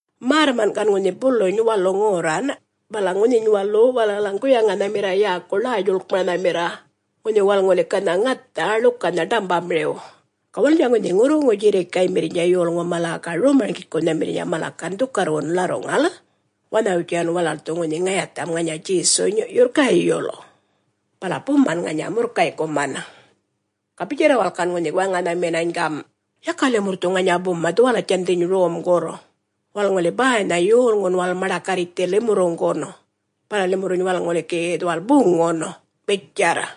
Märrman' gan ŋunhi buluny walu ŋorran bala ŋunhiny walu walalaŋ guyaŋanhamirra yäku Ḻäy-Djuḻkmaranhamirra, ŋunhi walal ŋuli ganha ŋatha ḻukanha ḏambamiriw. Ga walalnydja ŋunhi ŋurruŋu djirrikaymirrnydja yolŋu mala ga rom-marŋgikunhamirrnydja mala gan dhukarrwun ḻarruŋal wanhawitjan walal dhu ŋunhi ŋayatham ŋanya Djesuny yurr gayul, bala buman ŋanya murrkay'kuman. Ga bitjarra walal gan ŋunhi waŋanhaminany gam', “Yaka limurr dhu ŋanya buma dhuwalatjandhiny romgurr, walal ŋuli bäynha yolŋun walal maḏakarritjthi limurruŋgun, bala limurruny walal ŋuli gi dhuwal buŋun,” bitjarr.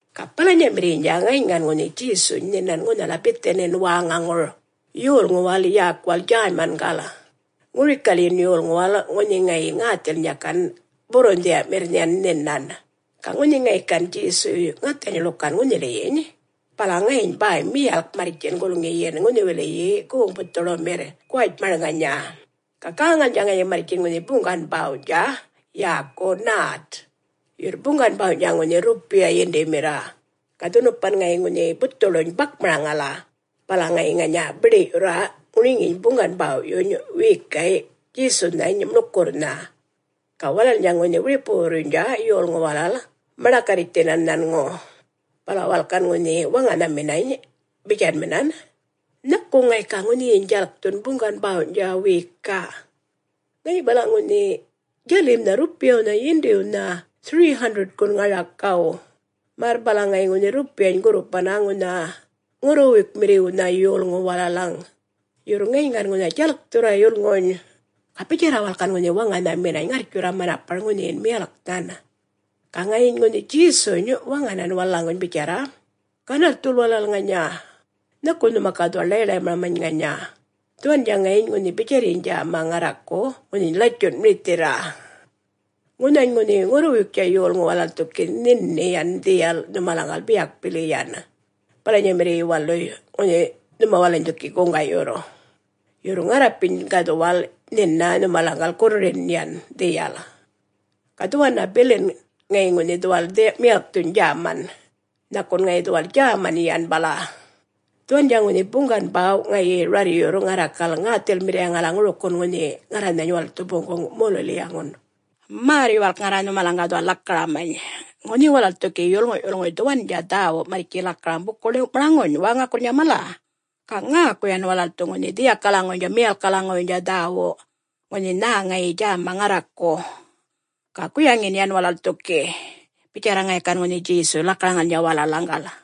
Ga balanyamirriynydja ŋayiny gan ŋunhi Djesuny nhinan ŋunhala Bithinin wäŋaŋur, yolŋuwal yäkuwal Djäymangal, ŋurikalyin yolŋuwal ŋunhi ŋayi ŋäthilnydja gan burrunhdhiya'mirr yan nhinan. Ga ŋunhi ŋayi gan Djesuy ŋathany ḻukan ŋunhiliyiny, bala ŋayiny bäy miyalk marrtjin gulŋiyin ŋunhiwiliyi goŋ buthuḻumirr guwatjmar ŋanya, ga gäŋalnydja ŋayi marrtjin ŋunhi buŋgan bäwny'tja, yäku nät, yurr buŋgan bäwny'tja ŋunhi rrupiya yindimirra. Ga dhunupan ŋayi ŋunhi buthuḻuny bakmaraŋala, bala ŋayi ŋanya biḏi'yurra ŋuriŋiyiny buŋgan bäw'yuny wiyikay' Djesunhany muḻkurrnha. Ga walalnydja ŋunhi wiripuwurrnydja yolŋu walal maḏakarritjthinan nhanŋu, bala walal gan ŋunhi waŋanhaminan bitjanminan, “Nhaku ŋayi ga ŋunhiyiny djalkthun buŋgan bäwny'tja wiyika'? Ŋayi balaŋ ŋunha djalimnha rrupiyawnha yindiwnha 300-gun ŋarakaw, märr balaŋ ŋayi ŋunhi rrupiyany gurrupanna ŋunha ŋurruwuykmirriwnha yolŋuw walalaŋ, yurr ŋayiny gan ŋunha djalkthurra yulŋuny,” ga bitjarra walal gan ŋunhi waŋanhaminany ŋarrtjurra manapar ŋunhiyin miyalknhan. Ga ŋayiny ŋunhi Djesuny waŋanan walalaŋguny bitjarra, “Ganarrthul walal ŋanya. Nhaku nhuma ga dhuwal ḻay-ḻaymaramany ŋanya dhuwandja ŋayi ŋunhi bitjarryiny djäma ŋarraku, ŋunhiny latjun mirithirra. Ŋunhany ŋunhi ŋurruwuyktja yolŋu walal dhu gi nhini yan dhiyal nhumalaŋgal biyak muka bili, bawalamirriy waluy nhuma walalany dhu gi guŋga'yurr. Yurr ŋarrapiny ga dhuwal nhina nhumalaŋgal gurrurin yan dhiyal. Ga dhuwanna bili ŋayin dhuwal dhiyaŋun miyalkthun djämany, nhakun ŋayi dhuwal djäman yan bala. Dhuwandja ŋunhi buŋgan bäw' ŋayi rarryurr ŋarrakal ŋäthilmirriyaŋala ŋurikin ŋunhi ŋarranhany walal dhu boŋguŋ molulilyaŋun. Märr-yuwalk ŋarra nhumalaŋ ga dhuwal lakaramany. Ŋunhi walal dhu gi yolŋu'-yulŋuy dhuwandja dhäwu marrtji lakaraŋ buku-ḻiw'maraŋuny wäŋakurrnydja mala, ga ŋäku yan walal dhu ŋunhi dhiyakalaŋuwuynydja miyalkkalaŋuwuynydja dhäwu, ŋunhi nhä ŋayi djäma ŋarraku, ga guyaŋin yan walal dhu gi,” bitjarra ŋayi gan ŋunhi Djesuy lakaraŋalnydja walalaŋgal.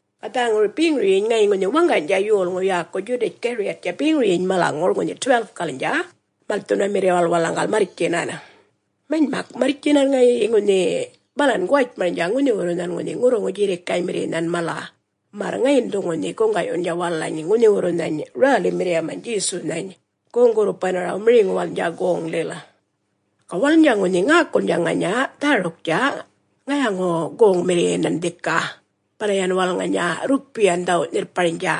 Ga dhäŋur beŋuryiny ŋayiny ŋunhi waŋganydja yolŋu yäku Djudatj-Gariyattja beŋuryiny malaŋur ŋunhi 12-kalnydja malthunamirriwal walalaŋgal marrtjinan. Manymak marrtjinany ŋayi ŋunhi balan guwatjmarnydja ŋunhiwurrunhan ŋunhi ŋurruŋu djirrikaymirrinhan mala, märr ŋayin dhu ŋunhi guŋga'yundja walalany ŋunhiwurrunhany … rälimirriyamany Djesunhany goŋ-gurrupanaraw miriŋuwalnydja goŋlil. Ga walalnydja ŋunhi ŋäkulnydja ŋanya dhäruktja ŋayaŋu-goŋmirriyanan dhika, bala yan ŋanya walal rrupiyan dhawu'-nhirrparnydja.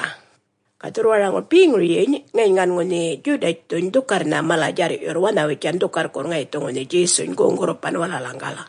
Ga dhurrwaraŋur beŋuryiny ŋayiny gan ŋunhi Djudatjthuny dhukarrnha mala-djarr'yurr wanhawitjan dhukarrkurr ŋayi dhu ŋunhi Djesuny goŋ-gurrupan walalaŋgal.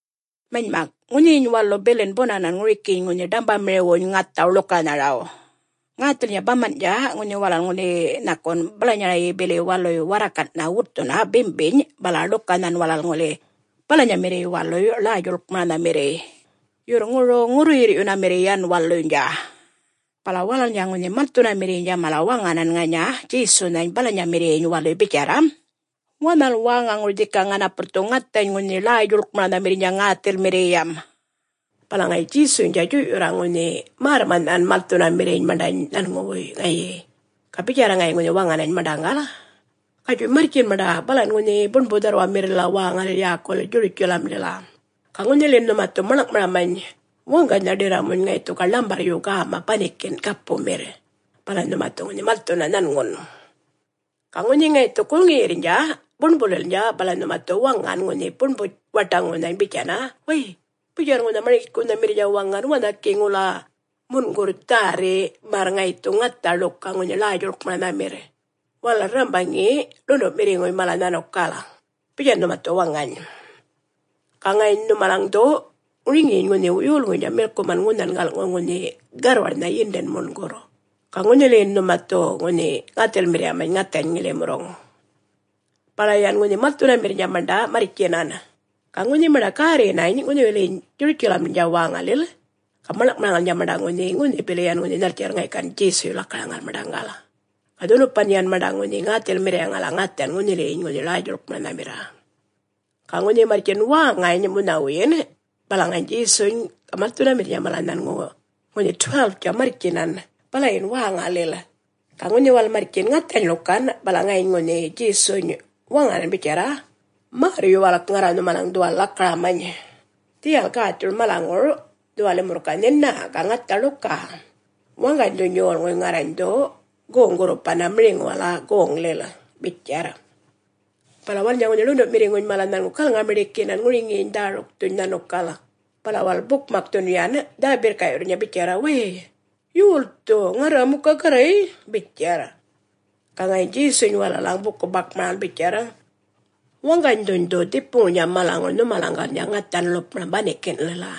Manymak ŋunhiyiny walu bilin bunanan ŋurikiny ŋunhi ḏambamiriwwuny ŋathaw ḻukanharaw. Ŋäthilnydja baman'tja ŋunhi walal ŋuli nhakun balanyarayyi bili waluy warrakan'nhan wutthunna bimbiny bala ḻukanhan walal ŋuli balanyamirriy waluy Ḻäy-djuḻkmaranhamirriy, yurr ŋuruŋ ŋurruyirr'yunamirriy yan waluynydja. Bala walalnydja ŋunhi malthunamirriynydja mala waŋanan ŋanya Djesunhany balanyamirriyyiny waluy bitjarra, “Wanhal wäŋaŋur dhika ŋanapurr dhu ŋathany ŋunhi Ḻäy-djuḻkmaranhamirrnydja ŋäthilmirriyam.” Bala ŋayi Djesuynydja djuy'yurra ŋunhi märrma'nhan malthunamirriny maṉḏany nhanŋuwuy ŋayi, ga bitjarra ŋayi ŋunhi waŋanany maṉḏaŋgal, “Gatjuy marrtjin maṉḏa balan ŋunhi buṉbu-dharrwamirrilila wäŋalil yäkulil Djurutjalamlila, ga ŋunhiliyiny nhuma dhu maḻŋ'maramany waŋganynha ḏirramuny ŋayi dhu ga ḻambarryu gäma banikin' gapumirr, bala nhuma dhu yan malthunna nhanŋu. Ga ŋunhi ŋayi dhu gulŋiyirrnydja buṉbulilnydja bala nhuma dhu waŋan ŋunhi buṉbu-waṯaŋunhany bitjanna, ‘Way, bitjarr ŋunha Marŋgikunhamirrnydja waŋan, wanha gi ŋula mungurr dhärri, märr ŋayi dhu ŋatha ḻuka ŋunhi Ḻäy-djuḻkmaranhamirr, walal rrambaŋi ḻundu'mirriŋuy mala nhanukal.’ Bitjanna nhuma dhu waŋany. Ga ŋayiny nhumalaŋgal dhu ŋuriŋiyiny ŋunhi yolŋuynydja milkuman ŋunhan gal'ŋu ŋunhi garrwarnha yindin mungurr, ga ŋunhiliyin nhuma dhu ŋäthilmirriyamany ŋathany ŋilimurruŋ.” Bala yan ŋunhi malthunamirrnydja maṉḏa marrtjinan. Ga ŋunhi maṉḏa gärrinanany ŋunhiliyiny Djurutjalamdja wäŋaŋur, ga maḻŋ'maraŋalnydja maṉḏa ŋunhi, ŋunhi bili yan ŋunhi nhaltjarr ŋayi gan Djesuy lakaraŋal maṉḏaŋgal. Ga dhunupan yan maṉḏa ŋunhi ŋäthilmirriyaŋala ŋathan ŋunhiliyiny ŋunhi Ḻäy-djuḻkmaranhamirra. Ga ŋunhi marrtjin wäŋany munhawuyin bala ŋayiny Djesuny ga malthunamirrnydja mala nhanŋu ŋunhi 12-tja marrtjinan balayin wäŋalil. Ga ŋunhi walal marrtjin ŋathany ḻukan, bala ŋayiny ŋunhi Djesuny waŋanan bitjarra, “Märr-yuwalk ŋarra nhumalaŋ dhu dhuwal lakaramany. Dhiyal gäthur malaŋur dhuwal limurr ga nhina ga ŋatha ḻuka, waŋganydhuny yolŋuy ŋarrany dhu ŋunhi goŋ-gurrupanna miriŋuwal goŋlil,” bitjarr. Bala walalnydja ŋunhi ḻundu'mirriŋuny mala nhanŋu galŋa-miḏikinan ŋuriŋiyiny dhärukthuny nhanukal, bala walal bukmakthun yan dhä-birrka'yurrnydja bitjarra, “Wäy, yolthu … ŋarra muka Garray bitjarr.” Ga ŋayiny Djesuny walalaŋ buku-bakmaraŋal bitjarr, “Waŋganydhuny dhu dhipuŋurnydja malaŋur nhumalaŋgalnydja ŋathan ḻupmaram banikin'lila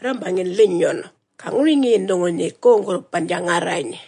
rrambaŋin linyun, ga ŋuriŋiyin dhu ŋunhi goŋ-gurrupandja ŋarrany.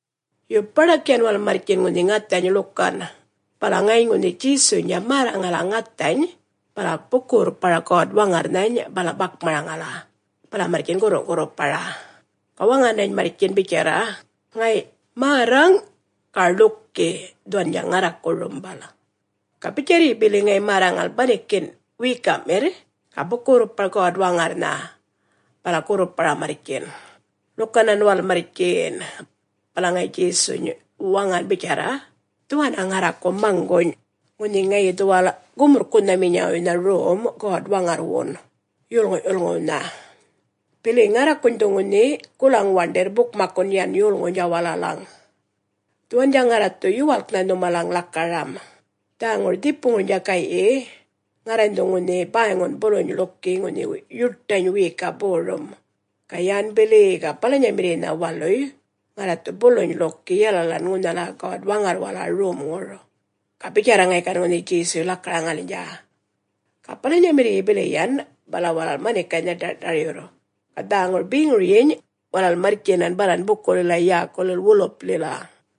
Yo baḏak yan walal marrtjin ŋunhi ŋathany ḻukan, bala ŋayiny ŋunhi Djesuynydja märraŋala ŋathany bala buku-gurrpara God-Waŋarrnhany bala bakmaraŋala, bala marrtjin gurru'-gurrupara, ga waŋanany marrtjin bitjarra, “Ŋay'! Märraŋ ga ḻuki, dhuwandja ŋarraku rumbal.” Ga bitjarryi bili ŋayi märraŋal banikin' wiyika'mirr ga buku-gurrpar God-Waŋarrnha, bala gurrupara marrtjin, ḻukanan walal marrtjin. Bala ŋayi Djesuny waŋan bitjarra, “Dhuwanna ŋarraku maŋguny'. Ŋunhi ŋayi dhuwal gumurrkunhaminyawuynha rom God-Waŋarrwun yolŋu'-yulŋuwnha, bili ŋarrakuny dhu ŋunhi gulaŋ-waṉḏirr bukmakkun yan yolŋuwnydja walalaŋ. Dhuwandja ŋarra dhu yuwalknha nhumalaŋ lakaram; Dhäŋur dhipuŋurnydja gay'yi ŋarrany dhu ŋunhi bäyŋun buluny ḻuki ŋunhi yuṯany wiyika borum, ga yän bili ga balanyamirriynha waluy, ŋarra dhu buluny ḻuki yalalan ŋunhala God-Waŋarrwala romŋur,” ga bitjarr ŋayi gan ŋunhi Djesuy lakaraŋalnydja. Ga balanyamirriy bili yan bala walal manikaynha ḏar'ṯaryurr ga dhäŋur beŋuryiny walal marrtjinan balan bukulila yäkulil Woliplila.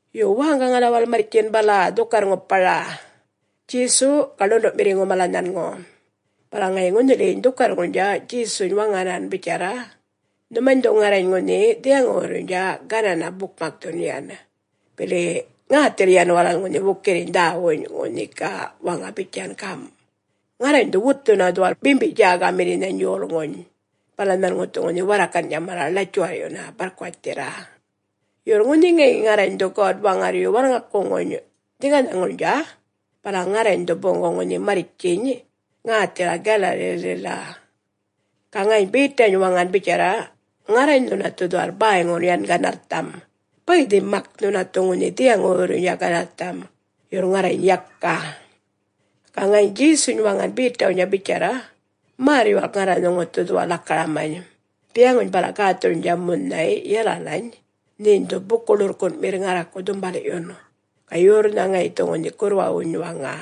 Yo, wäŋgaŋala walal marrtjin bala dhukarr-ŋupara, Djesu ga ḻundu'mirriŋu mala nhanŋu, bala ŋayi ŋunhiliyiny dhukarrŋurnydja Djesuny waŋanan bitjarr, “Nhumany dhu ŋarrany ŋunhi dhiyaŋuwurruynydja ganana bukmakthun yan, bili ŋäthil yan walal ŋunhi wukirriny dhäwuny, ŋunhi ga waŋa bitjan gam', ‘Ŋarrany dhu wutthuna dhuwal bimbi-djägamirrinhany yolŋuny, bala nhanŋu dhu ŋunhi warrakan'tja mala ḻatjuwarr'yunna barrkuwatjthirra.’” “Yurr ŋunhi ŋayi ŋarrany dhu God-Waŋarryu walŋakuŋuny dhiŋganhaŋurnydja, bala ŋarrany dhu boŋguŋ ŋunhi marrtjiny ŋäthila Galalilila.” Ga ŋayiny Betany waŋan bitjarra, “Ŋarrany nhuna dhu dhuwal bäyŋu yan ganarrtham. Bäydhi mak nhuna dhu ŋunhi dhiyaŋuwurruynydja ganarrtham, yurr ŋarrany yaka.” Ga ŋayiny Djesuny waŋan Betawnydja bitjarr, “Märr-yuwalk ŋarra nhuŋu dhu dhuwal lakaramany. Dhiyaŋuny bala gäthurrnydja munhay yalalany, nheny dhu buku-ḻurrkun'mirr ŋarraku dhumbal'yun, ga yorrnha ŋayi dhu ŋunhi gurrwawuny waŋa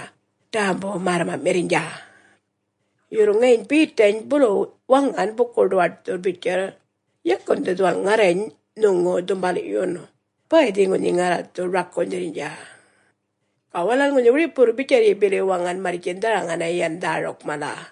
ḏämbu märrma'mirrnydja.” Yurr ŋayiny Betany bulu waŋan buku-ḏuwaṯthurr bitjarr, “Yakan dhu dhuwal ŋarrany nhuŋu dhumbal'yun! Bäydhi ŋunhi ŋarra dhu rakunydhirrnydja!” Ga walal ŋunhi wiripuwurr bitjarryi bili waŋan marrtjin dharaŋana yan dhäruk mala.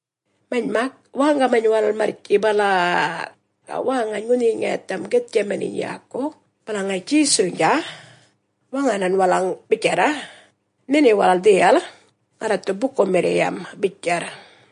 Manymak wäŋgamany walal marrtji bala-a-a, ga wäŋany ŋunhiyiny ŋayatham Githtjamaniny yäku, bala ŋayi Djesuynydja waŋanan walalany bitjarra, “Nhini walal dhiyal, ŋarra dhu bukumirriyam,” bitjarr.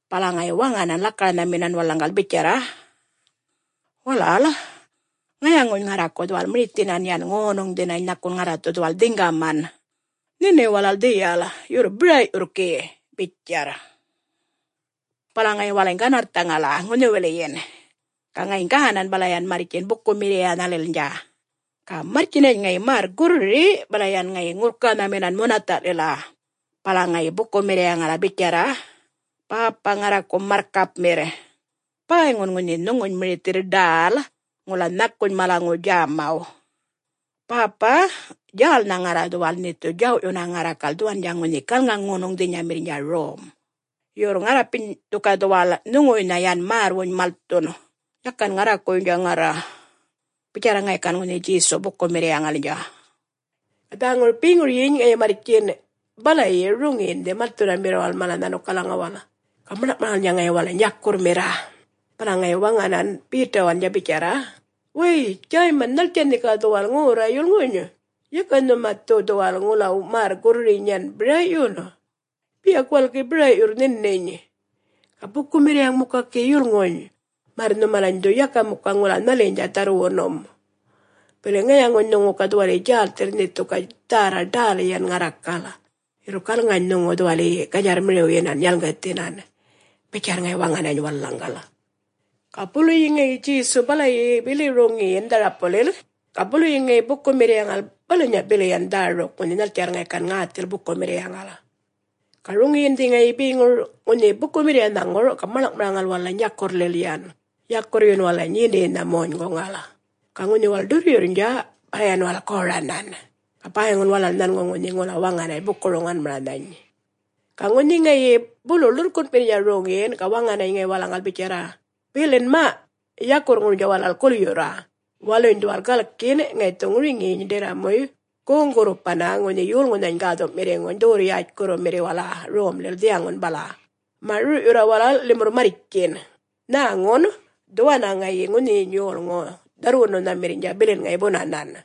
bala ŋayi waŋanan lakaranhaminan walalaŋgal bitjarra, “Walal ŋayaŋuny ŋarraku dhuwal mirithinan yan ŋonuŋdhinany nhakun ŋarra dhu dhuwal dhiŋgaman. Nhini walal dhiyal, yurr bira'yurr gi,” bitjarr. Bala ŋayi walalany ganarrthaŋala ŋunhiwiliyin, ga ŋayiny gänan bala yan marrtjin bukumirriyanhalilnydja. Ga marrtjinany ŋayi märr-gurriri bala yan ŋayi ŋurrkanhaminan munatha'lila bala ŋayi gan bukumirriyaŋala bitjarra, “Bäpa ŋarraku marrkapmirr, bäyŋun ŋunhi nhuŋuny mirithirr ḏäl ŋula nhakuny malaŋuw djämaw. Bäpa djälnha ŋarra dhuwal nhe dhu djaw'yunna ŋarrakal dhuwandja ŋunhi galŋa-ŋonuŋdhinyamirrnydja rom. Yurr ŋarrapiny dhu ga dhuwal nhuŋuwuynha yan märrwuny malthun yakan ŋarrakuwuynydja ŋarra,” bitjarra ŋayi gan ŋunhi Djesu bukumirriyaŋalnydja. Ga dhäŋur beŋuryiny ŋayi marrtjin balayi roŋiyindhi malthunamirriwal mala nhanukalaŋuwal, ga maḻŋ'maraŋalnydja ŋayi walalany yakurrmirra. Bala ŋayi waŋan Betawalnydja bitjarra, “Wäy Djäyman, nhaltjan nhe ga dhuwal ŋorra yulŋuny? Yaka nhuma dhu dhuwal ŋula märr gurririny yan bira'yun. Biyak walal gi bira'yurr nhininy, ga bukumirriyaŋ muka gi yulŋuny, märr nhumalany dhu yaka muka ŋula nhaliynydja dharrwunum. Bili ŋayaŋuny nhuŋu ga dhuwaliyi djälthirr nhe dhu ga dhärra ḏäl yan ŋarrakal, yurr galŋany nhuŋu dhuwaliyi ganydjarrmiriwyinan yalŋgithinan,” bitjarra ŋayi waŋanany walalaŋgal. Ga buluyi ŋayi Djesu balayi bili roŋiyin dharapullil, ga buluyi ŋayi bukumirriyaŋal balanya bili yan dhäruk ŋunhi nhaltjarr ŋayi gan ŋäthil bukumirriyaŋal. Ga roŋiyindhi ŋayi beŋur ŋunhi bukumirriyanhaŋur ga maḻŋ'maraŋal walalany yakurrlil yan, yakurryun walalany yindiynha monyguŋal. Ga ŋunhi walal ḏurryurrnydja, bala yan walal goranan, ga bäyŋun walal nhanŋu ŋunhi ŋula waŋanany buku-roŋanmaranhany. Ga ŋunhi ŋayi bulu ḻurrkun'mirrnydja roŋiyin, ga waŋanany ŋayi walalaŋgal bitjarra, “Bilin ma! yakurrŋurnydja walal gulyurra? Waluny dhuwal galkin, ŋayi dhu ŋuriŋiyiny ḏirramuy goŋ-gurrupanna ŋunhi Yolŋunhany Gäthu'mirriŋuny dhuwurr-yätjkurrumirriwala romlil dhiyaŋun bala. Ma'! Rur'yurra walal limurr marrtjin. Nhäŋun dhuwanna ŋayi ŋunhiyiny yolŋu dharrwununhamirrnydja bilin ŋayi bunanan.”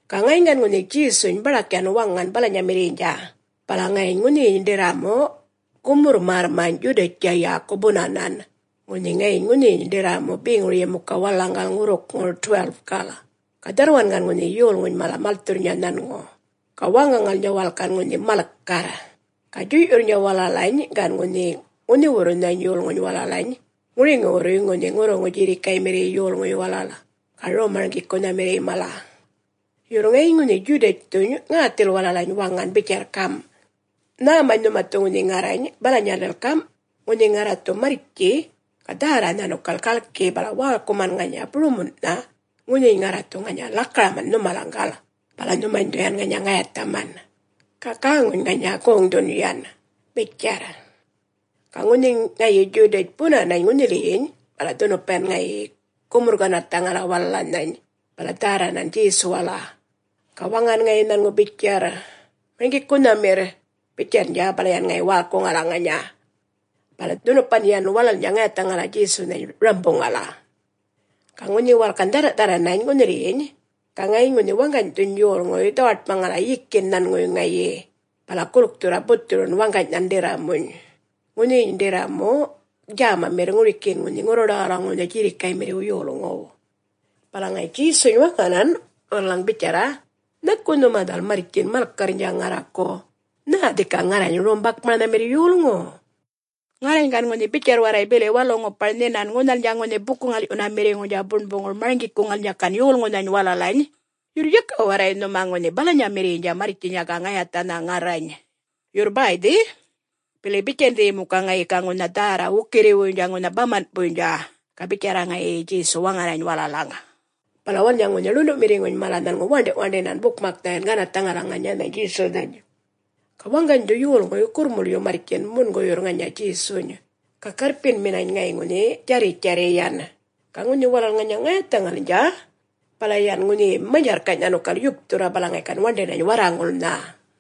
Ga ŋayiny gan ŋunhi Djesuny baḏak yan waŋan balanyamirriynydja, bala ŋayiny ŋunhiyiny ḏirramu gumurr-märrmany' Djudatjtja yäku bunanan, ŋunhi ŋayiny ŋunhiyiny ḏirramu beŋuryi muka walalaŋgal ŋurrukŋur 12-gal. Ga dharrwan gan ŋunhi yolŋuny mala malthurrnydja nhanŋu, ga wäŋgaŋalnydja walal gan ŋunhi malkarr. Ga djuy'yurrnydja walalany gan ŋunhi ŋunhiwurrunhany yolŋuny walalany ŋuriŋiwurruy ŋunhi ŋurruŋu djirrikaymirriy yolŋuy walal, ga Rom-marŋgikunhamirriy mala. Yurr ŋayiny ŋunhi Djudatjthuny ŋäthil walalany waŋan bitjarr gam', “Nhämany nhuma dhu ŋunhi ŋarrany balanyalil gam', ŋunhi ŋarra dhu marrtji, ga dhärra nhanukal galki bala wälkuman ŋanya burumun'nha ŋunhiny ŋarra dhu ŋanya lakaraman nhumalaŋgal. Bala nhumany dhu yan ŋanya ŋayathaman, ga gäŋuny ŋanya goŋdhun yan,” bitjarr. Ga ŋunhi ŋayi Djudatj bunanany ŋunhiliyiny, bala dhunupan yan ŋayi gumurr-ganarrthaŋala walalanhany bala dhärranan Djesuwala ga waŋan ŋayi nhanŋu bitjarr, “Marŋgikunhamirr,” bitjarrnydja, bala yan ŋayi wälkuŋala ŋanya. Bala dhunupan yan walalnydja ŋayathaŋala Djesunhany rambuŋala. Ga ŋunhi walal gan dhärra'-dharranany ŋunhiliyiny ga ŋayiny ŋunhi waŋganydhuny yolŋuy dhawaṯmaraŋala yikin nhanŋuwuy ŋayi, bala gulkthurra buthurun waŋganynhan ḏirramuny. Ŋunhiyiny ḏirramu djämamirr ŋurikiyin ŋunhi ŋurruḏawalaŋuwnha djirrikaymirriw yolŋuw. Bala ŋayi Djesuny waŋanan walalaŋ bitjarra, “Nhaku nhuma dhuwal marrtjin malkarrnydja ŋarraku? Nhä dhika ŋarrany rom-bakmaranhamirr yolŋu? Ŋarrany gan ŋunhi bitjarr warray bili walu-ŋupar nhinan ŋunhalnydja ŋunhi buku-ŋal'yunamirriŋurnydja buṉbuŋur marŋgikuŋalnydja gan yolŋunhany walalany, yurr yaka warray nhuma ŋunhi balanyamirriynydja marrtjinya ga ŋayathanha ŋarrany. Yurr bäydhi. Bili bitjandhiyi muka ŋayi ga ŋunha dhärra wukirriwuynydja ŋunhi baman'puynydja,” ga bitjarra ŋayi Djesu waŋanany walalaŋ. Bala walalnydja ŋunhi ḻundu'mirriŋuny mala nhanŋu waṉḏi'-waṉḏinan bukmaknha yan ganarrthaŋala ŋanyanhany Djesunhany. Ga waŋganydhu yolŋuy gurrmulyu marrtjin munguyurr ŋanya Djesuny, ga garrpinminany ŋayi ŋunhi djarritjarriy yan. Ga ŋunhi walal ŋanya ŋayathaŋalnydja bala yan ŋunhiyi manydjarrkany' nhanukal yupthurra, bala ŋayi gan waṉḏinany warraŋulnha.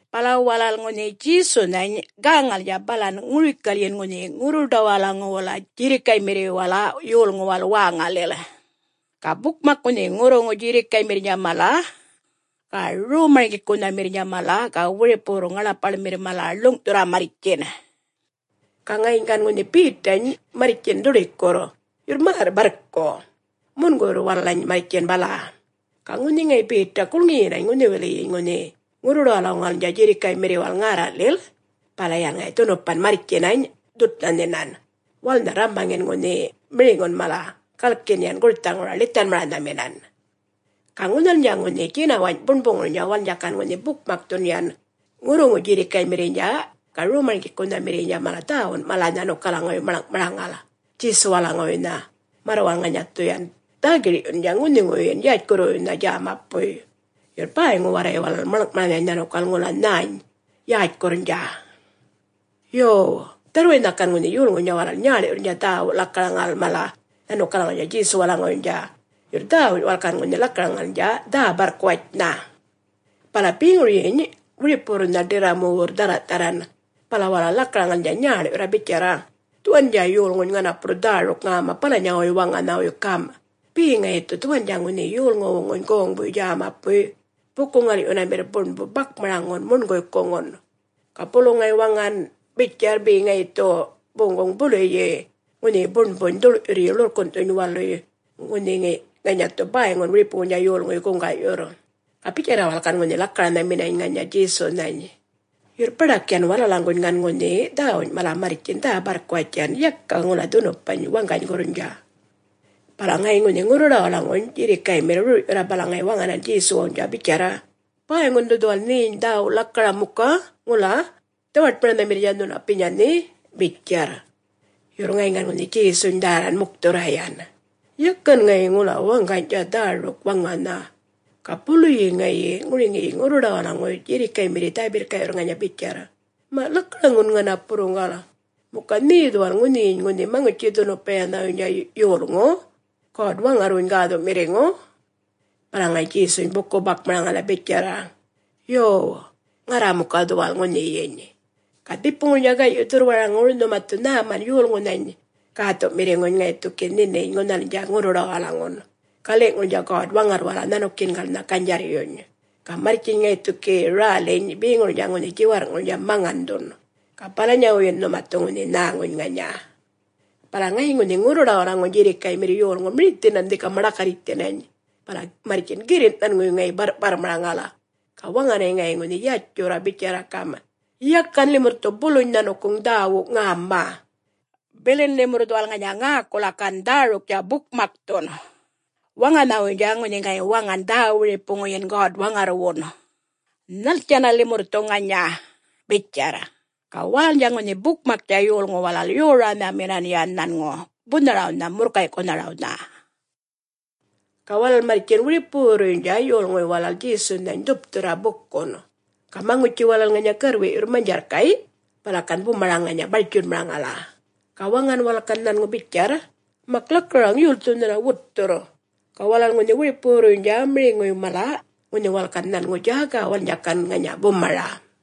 Bala walal ŋunhi Djesunhany gäŋalnydja balan ŋurikalyin ŋunhi ŋurruḏawalaŋuwala djirrikaymirriwala yolŋuwal wäŋalil. Ga bukmak ŋunhi ŋurruŋu djirrikaymirrnydja mala ga Rom-marŋgikunhamirrnydja mala ga wiripuwurr ŋaḻapaḻmirr mala ḻuŋ'thurra marrtjin. Ga ŋayiny gan ŋunhi Betany marrtjin dhuḏikurr, yurr märr-barrku, munguyurr walalany marrtjin bala. Ga ŋunhi ŋayi Beta gulŋiyinany ŋunhiwiliyiny ŋunhi ŋurruḏawalaŋuwalnydja djirrikaymirriwal ŋärra'lil, bala yan ŋayi dhunupan marrtjinany, dhutnha nhinan walalnha rrambaŋin ŋunhi miriŋun mala, galkin yan gurthaŋura ḻithanmaranhaminan. Ga ŋunhalnydja ŋunhi djinawany' buṉbuŋurnydja walalnydja gan ŋunhi bukmakthun yan ŋurruŋu djirrikaymirriynydja ga rom djägamirriynydja mala dhäwun mala nhanukalaŋuwuy maḻŋ'maraŋal Djesuwalaŋuwuynha, märr walal dhu ŋanya yan dhä-gir'yunna ŋunhiŋuwuyyin yätjkurruyanhawuynha djämapuy, yurr bäyŋu warray walal maḻŋ'maranhany nhanukal ŋula nhäny yätjkurrnydja. Yo dharrwaynha gan ŋunhi yolŋuynydja walal nyäḻ'yurrnydja dhäwu mala lakaraŋal nhanukalaŋawuynydja Djesuwalaŋuwuynydja, yurr dhäwuny mala walal gan ŋunhi lakaraŋalnydja dhä-barrkuwatjnha. Bala beŋuryiny wiripuwurrnha ḏirramuwurr dhärra'-dharran bala walal lakaraŋalnydja nyäḻ'yurra bitjarra, “Dhuwandja yolŋuny ŋanapurr dhäruk ŋäma balanyawuy waŋanhawuy gam', be ŋayi dhu dhuwandja ŋunhi yolŋuwuŋuny goŋbuy djämapuy buku-ŋal'yunamirr buṉbu bakmaraŋun muṉguykuŋun. Ga bulu ŋayi bitjan waŋa be ŋayi dhu boŋguŋ buluyi ŋunhiyi buṉbuny dhuḻ'yurryi ḻurrkun'thuny waluy, ŋunhi ŋanya dhu bäyŋun wiripuŋuynydja yolŋuy guŋga'yurr.” Ga bitjarra walal gan ŋunhi lakaranhaminany ŋanya Djesunhany. Yurr baḏak yan walalaŋguŋ gan ŋunhi dhäwuny mala marrtjin dhä-barrkuwatj yan yaka ŋula dhunupany waŋganygurrnydja. Bala ŋayiny ŋunhi ŋurruḏawalaŋuny djirrikaymirr rur'yurra, bala ŋayi waŋanan Djesuwnydja bitjarra, “Bäyŋun dhu dhuwal nheny dhäwu lakaram muka, ŋula dhawaṯmaranhamirrnydja nhunapinya nhe?” bitjarr. Yurr ŋayiny gan ŋunhi Djesuny dhärran mukthurra yan, yakan ŋayi ŋula waŋganydja dhäruk waŋanha. Ga buluyi ŋayi ŋuriŋiyi ŋurruḏawalaŋuy djirrikaymirriy dhä-birrka'yurr ŋanya bitjarr, “Ma' lakaraŋun napurruŋgal. Muka nhe dhuwal ŋunhiyiny ŋunhi Maŋutji-dhunupayanhawuynydja Yolŋu! … God-Waŋarrwuny Gäthu'mirriŋu?” Bala ŋayi Djesuny buku-bakmaraŋala bitjarra, “Yo, Ŋarra muka dhuwal ŋunhiyiny. Ga dhipuŋurnydja gay'yi dhurrwaraŋur nhuma dhu nhäman Yolŋunhany Gäthu'mirriŋuny ŋayi dhu gi nhininy ŋunhalnydja ŋurruḏawalaŋun, gali'ŋurnydja God-Waŋarrwala nhanukiyingalnha ganydjarryuny. Ga marrtjiny ŋayi dhu roŋiyiny räliny beŋurnydja ŋunhi djiwarr'ŋurnydja maŋandhun, ga balanyawuyyin nhuma dhu ŋunhi nhäŋuny ŋanya.” Bala ŋayiny ŋunhi ŋurruḏawalaŋuny djirrikaymirr yolŋu mirithinan dhika maḏakarritjthinany, bala marrtjin girrin' nhanŋuwuy ŋayi barr'parrmaraŋal, ga waŋanany ŋayi ŋunhi yatjurra bitjarra gam', “Yakan limurr dhu buluny nhanukuŋ dhäwu ŋäma. Bilin limurr dhuwal ŋanya ŋäkula gan dhäruktja bukmakthun, waŋanhawuynydja ŋunhi ŋayi waŋan dhä-wiripuŋuyin God-Waŋarrwun. Nhaltjanna limurr dhu ŋanya?” bitjarr. Ga walalnydja ŋunhi bukmaktja yolŋu walal yoranhaminan yan nhanŋu bunharawnha murrkay'kunharawnha. Ga walal marrtjin ŋunhi wiripuwurruynydja yolŋuy walal Djesunhany dhupthurra bukun. Ga maŋutji walal ŋanya garrwi'yurr manydjarrkay', bala gan bumara ŋanya bartjunmaraŋala, ga waŋan walal gan nhanŋu bitjarr, “Ma lakaraŋ yolthu nhuna wutthurr?” Ga walal ŋunhi wiripuwurruynydja miriŋuy mala ŋunhi walal gan nhanŋu djäga walalnydja gan ŋanya bumara.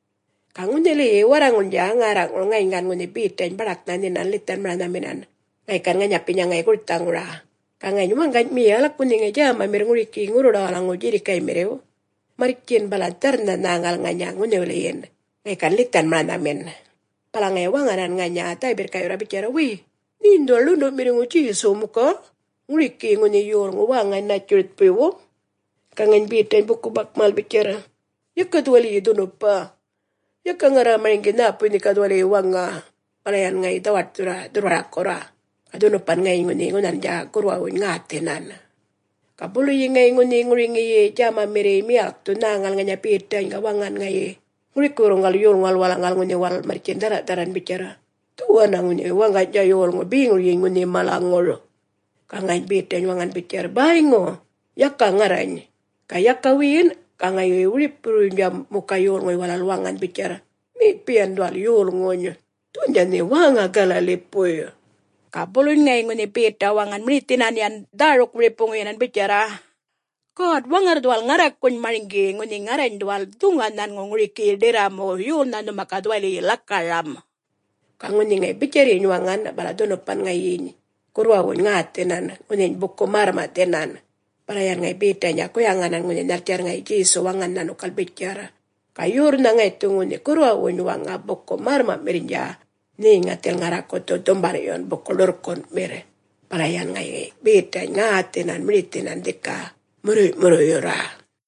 Ga ŋunhiliyi warraŋulnydja ŋärra'ŋur ŋayiny gan ŋunhi Betany baḏaknha nhinan ḻithanmaranhamin ŋayi gan ŋanyapinya ŋayi gurthaŋura. Ga ŋayiny waŋgany miyalk ŋunhi ŋayi djämamirr ŋurikiyi ŋurruḏawalaŋuw djirrikaymirriw marrtjin bala dharrnha nhäŋal ŋanya ŋunhiwiliyin, ŋayi gan ḻithanmaranhamin, bala ŋayi waŋanan ŋanya dhä-birrka'yurra bitjarra, “Way, nheny dhuwal ḻundu'mirriŋu Djesuw muka? … ŋurikiyi ŋunhi yolŋuw wäŋa Nätjuritjpuywu?” Ga ŋayiny Betany buku-bakmaraŋal bitjarr, “Yaka dhuwaliyi dhunupa. Yaka ŋarra marŋgi nhäpuy nhe ga dhuwaliyi waŋa.” Bala yan ŋayi dhawaṯthurra dhurrwarakurra, ga dhunupan ŋayiny ŋunhi ŋunhalnydja gurrwawuny ŋäthinan. Ga buluyi ŋayi ŋunhi ŋuriŋiyi djämamirriy miyalkthu nhäŋal ŋanya Betany, ga waŋan ŋayi ŋurikiwurruŋgal yolŋuwal walalaŋgal ŋunhi walal marrtjin dhärra'-dharran bitjarr, “Dhuwanna ŋunhi waŋganydja yolŋu beŋuryiny ŋunhi malaŋur.” Ga ŋayiny Betany waŋan bitjarr, “Bäyŋu … Yaka ŋarrany!” Ga yaka wiyin ga wiripuwurrnydja muka yolŋu walal waŋan bitjarr, “Nhepi yan dhuwal yolŋuny. Dhuwandja nhe wäŋa Galalipuy!” Ga buluny ŋayi ŋunhi Beta waŋan mirithinan yan dhäruk-wiripuŋuyinan bitjarra, “God-Waŋarr dhuwal ŋarrakuny marŋgi, ŋunhi ŋarrany dhuwal dhuŋa nhanŋu ŋurikiyi ḏirramuw, yolnha nhuma ga dhuwali lakaram!” Ga ŋunhi ŋayi bitjarryiny waŋan, bala dhunupan ŋayiny gurrwawuny ŋäthinan, ŋunhiny buku-märrma'thinan. Bala yan ŋayi Betaynydja guyaŋan ŋunhi nhaltjarr ŋayi Djesu waŋan nhanukal bitjarr, “Ga yorrnha ŋayi dhu ŋunhi gurrwawuny waŋa buku-märrma'mirrnydja, nheny ŋathil ŋarraku dhu dhumbal'yun buku-ḻurrkun'mirr.” Bala yan ŋayi Betany ŋäthinany mirithinan dhika murruy'-murruyurra.